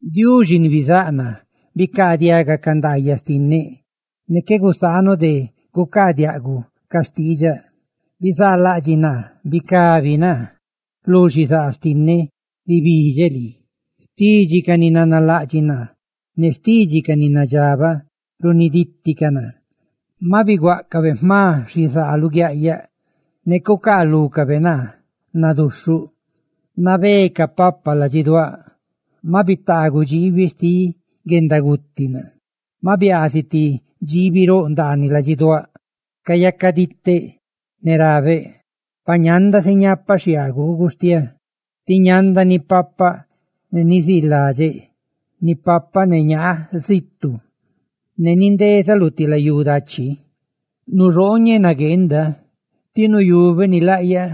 Diuxi ni bizáꞌ naa, bicaadiaga ca ndaayaꞌ xtinneꞌ; ne qué gusaanuꞌ de gucaadiaꞌguꞌ ca xtiidxaꞌ. Bizaalaꞌdxiꞌ naa, bicabi naa; lu xizaa xtinneꞌ ribidxeꞌ lii. Xtidxi ca ni nanalaꞌdxiꞌ naa ne xtidxi ca ni nadxabaꞌ runidíticaꞌ naa. Maꞌ biguáꞌcabe jma xizaa luguiaꞌyaꞌ; ne cucaalúcabe naa naduxhuꞌ. Nabé capapa ladxiduáꞌ; maꞌ bitaaguꞌ dxiibi xtiꞌ guendaguti naa. Maꞌ biaaziꞌ ti dxiibi roꞌ ndaaniꞌ ladxiduáꞌ; ¡Cadxibeꞌ ne cayacadiꞌteꞌ! Ne rabeꞌ: «Pa ñanda si ñapaꞌ xhiaa gugustiá; ti ñanda nipapaꞌ ne niziiladxeꞌ. Nipapaꞌ ne ñaa zitu; ne nindezaꞌ lu ti layú dachi. Nuxooñeꞌ nagueenda ti nuyubeꞌ nilaꞌyaꞌ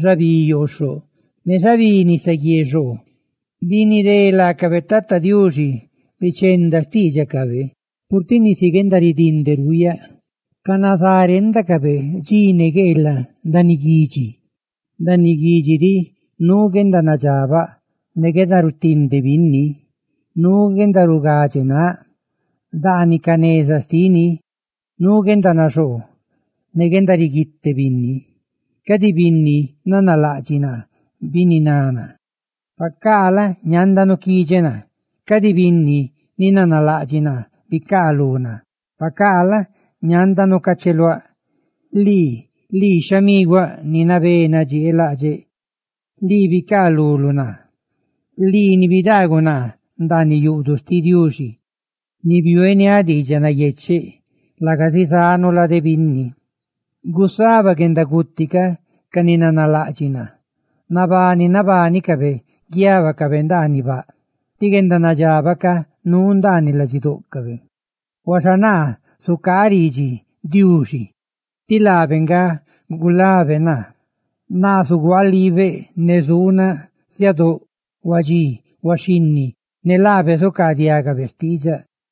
xabí yooxhoꞌ ne xabí nisaguié xoo.» Binidé laacabe, Tata Diuxi, bichenda xtiidxacabe, purtiꞌ nisi guendaridinde ruuyaꞌ, canazá renda dxi ne gueelaꞌ ndaaniꞌ guidxi. Ndaaniꞌ guidxi diꞌ nuu guendanadxabaꞌ ne guendarutinde binni; nuu guendarugadxe náꞌ; ndaaniꞌ ca neza xtini nuu guendanaxoo ne guendariguite binni. Cadi binni nanalaꞌdxiꞌ naa, bininá naa, pacaa la? ñanda nuquidxeꞌ naa; cadi binni ni nanalaꞌdxiꞌ naa, bicaalú naa, pacaa la? ñanda nucacheluáꞌ. ¡Lii, lii xhamiguáꞌ ni nabé nadxieelaꞌdxeꞌ, lii bicaa luluꞌ naa, lii ni bidaaguꞌ naa ndaaniꞌ yuꞌduꞌ xtiꞌ Diuxi ni biueniáꞌ diidxaꞌ nayecheꞌ, laga zizanu lade binni! ¡Gusaba guendaguti ca ca ni nanalaꞌdxiꞌ naa! ¡Nabani nabánicabe guiábacabe ndaaniꞌ baꞌ, tí guendanadxabaꞌ ca nuu ndaaniꞌ ladxidóꞌcabe! Huaxa naa zucaaꞌ ridxi Diuxi; tí Tata Diuxi nga gulá naa. Naa zuguaaliibeꞌ ne zuunaꞌ siadóꞌ, huadxí ne huaxhinni, ne laabe zucaadiagabe xtiidxaꞌ.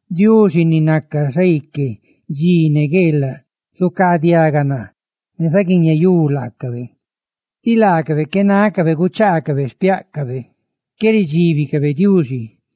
Diuxi, ni naca xaique dxi ne gueelaꞌ, zucaadiaga naa ne zaguiñeyú laacabe, tí laacabe qué nácabe guchaacabe xpiáꞌcabe ne nin qué ridxíbicabe Diuxi.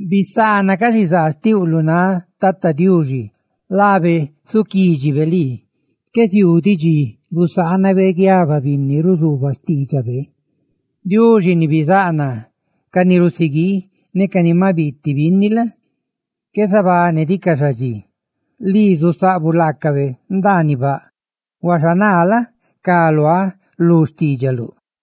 Bisaana ca xizaa xtiuꞌ lu náꞌ Tata Diuxi, ne laabe zúnibe lii naguidxi; qué ziuu diꞌ dxi gusaanabe guiaba binni ruzuubaꞌ xtiidxabe. Diuxi ni bizáꞌ naa, ca ni rusiguii ne ca ni maꞌ biiti binni la? qué zabanidicaꞌ nin galaa guendanabani xticaꞌ; lii zusaꞌbuꞌ laacabe ndaaniꞌ baꞌ, huaxa naa la? cá luáꞌ lu xtiidxaluꞌ.